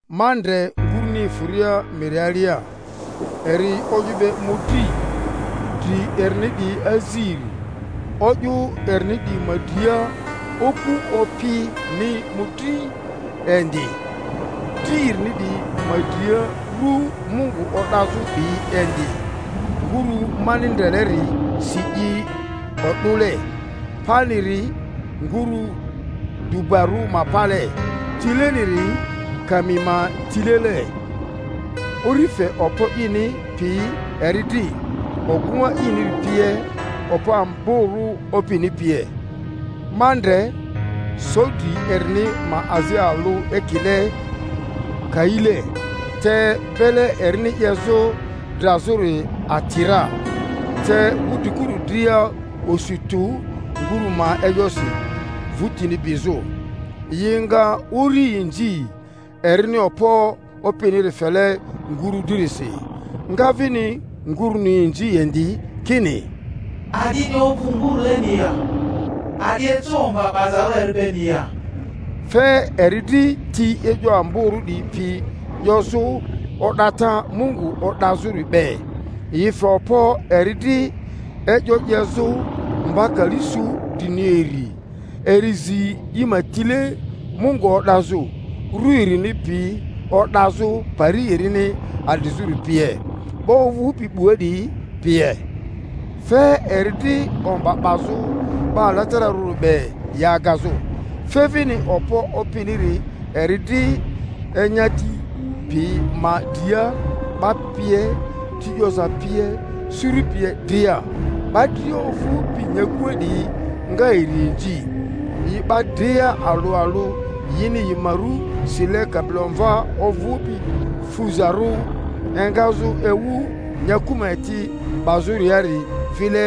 Ma ndre nguruni efᴜria miri alia, eri o'yᴜ be mᴜdri, dri erini 'diyi aziri, o'yᴜ erini 'diyi ma dria oku opini mᴜdri indi, dri erini 'diyi ma dria rᴜ Mungu o'dazᴜ 'diyi indi. Ngurᴜ mani ndreleri si i o'dᴜle, paniri ngurᴜ dubarᴜ ma pale, tileniri kami ma tilele. Uri fe okpo ini pi eri dri, ogᴜŋa iniri pie, okpo amborᴜ opini pie. Ma ndre so dri erini ma azi alᴜ ekile kaile, te bele erini 'yezᴜ drazᴜri ati ra, te wudrikuru dria osu tᴜ nguru ma e'yosi, vᴜtini bizᴜ. Yi nga uri inzi, erini okpo opiniri fele nguru dririsi, nga vini nguruni inzi indi kini, A'dini ovᴜ nguruleni ya? A'di eco omba 'bazarᴜ eri beni ya? Fe eri dri ti e'yo amborᴜ 'diyi pi 'yozᴜ, o'data Mungu o'dazᴜri be; yi fe okpo eri dri e'yo 'yezᴜ mba kali su drini iri. Eri zi i ma tile Mungu o'dazᴜ, rᴜ erini pi o'dazᴜ pari erini adrizᴜri pie, 'ba ovᴜpi 'bua 'diyi pie. Fe eri dri omba 'bazᴜ 'ba alatararᴜ be, yi agazᴜ. Fe vini okpo opiniri eri dri enyati pi ma dria, 'ba pie, ti 'yoza pie, suru pie dria. 'Ba dria ovᴜpi nyakua 'diyi nga eri inzi, yi 'ba dria alᴜ aIᴜ yini yi ma ru sile Kabilomva ovᴜpi fuzarᴜ engazᴜ ewu nyaku ma eti 'bazᴜriari vile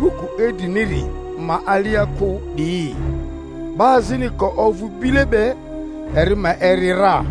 buku idriniri ma alia kᴜ 'diyi. 'Ba azini ka ovᴜ bile be, eri ma eri ra: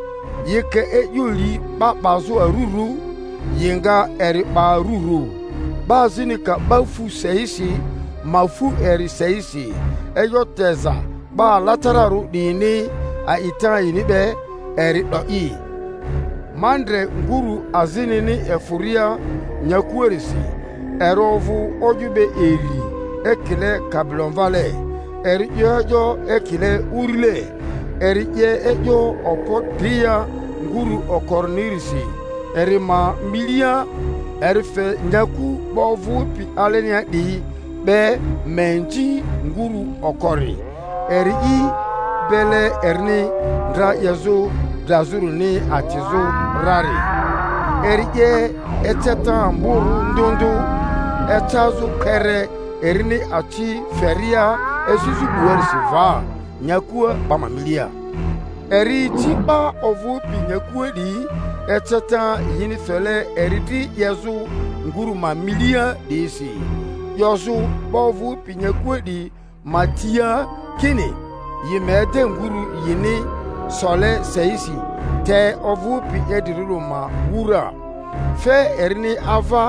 Yi ka e'yo li 'ba 'bazu arurᴜ, yi nga eri 'ba arurᴜ; 'ba azini ka 'ba fu seisi, ma fu eri seisi. E'yo teza 'ba alatararᴜ 'diyini, a'ita yini be eri 'do'i. Ma ndre nguru azinini efᴜria nyakuarisi; eri ovᴜ o'yᴜ be iri ekile kabilomvale, eri 'yo e'yo ekile urile. Eri 'ye e'yo okpo dria nguru okorinirisi eri ma milia. Eri fe nyaku 'ba ovᴜpi alenia 'diyi be ma inzi nguru okori, eri'i bele erini ndra 'yezᴜ drazᴜrini atizᴜ rari. Eri 'ye eceta amborᴜ ndᴜ ndᴜ, ecazᴜ kpere erini aci feria esizᴜ 'buarisi va nyakua 'ba ma milia. Eri ici 'ba ovᴜpi nyakua 'diyi eceta yini fele eri dri 'yezᴜ ngurᴜ ma milia 'diyisi, 'yozᴜ 'ba ovᴜpi nyakua 'diyi ma tia kini yi ma ede nguru yini sole seisi te ovᴜpi idrirᴜri ma wura. Fe erini ava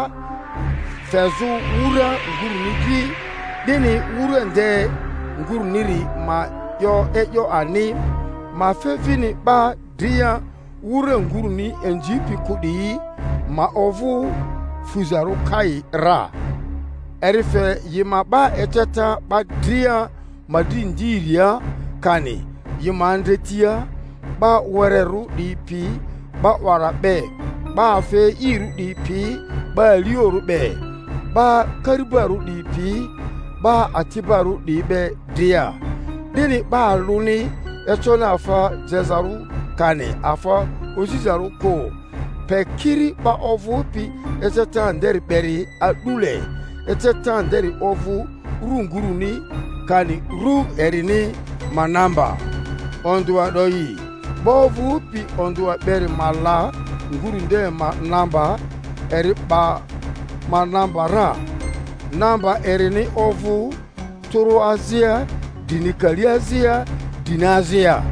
fezᴜ wura nguruni dri, 'dini wura nde nguruniri ma 'yo e'yo ani, ma fe vini 'ba dria wura nguruni inzipi kᴜ 'diyi ma ovᴜ fuzarᴜ kai ra. Eri fe yi ma 'ba eceta 'ba dria ma dri ndiria kani yi ma andretia, 'ba wererᴜ 'diyi pi 'ba 'wara be, 'ba afa e'irᴜ 'diyi pi 'ba aliorᴜ be, 'ba kari-'barᴜ 'diyi pi 'ba ati'barᴜ 'diyi be dria, 'dini 'ba alᴜni econi afa jezarᴜ kani afa ozizarᴜ kᴜ, pe kiri 'ba ovᴜpi eceta nderi beri a'dule, eceta nderi ovᴜ rᴜ nguruni kani rᴜ erini ma namba. Ondᴜa 'do'i. 'ba ovᴜpi ondᴜa beri ma la nguru nde ma namba; eri 'ba ma namba ra, namba erini ovᴜ tᴜrᴜ azia drini kali azia drini azia.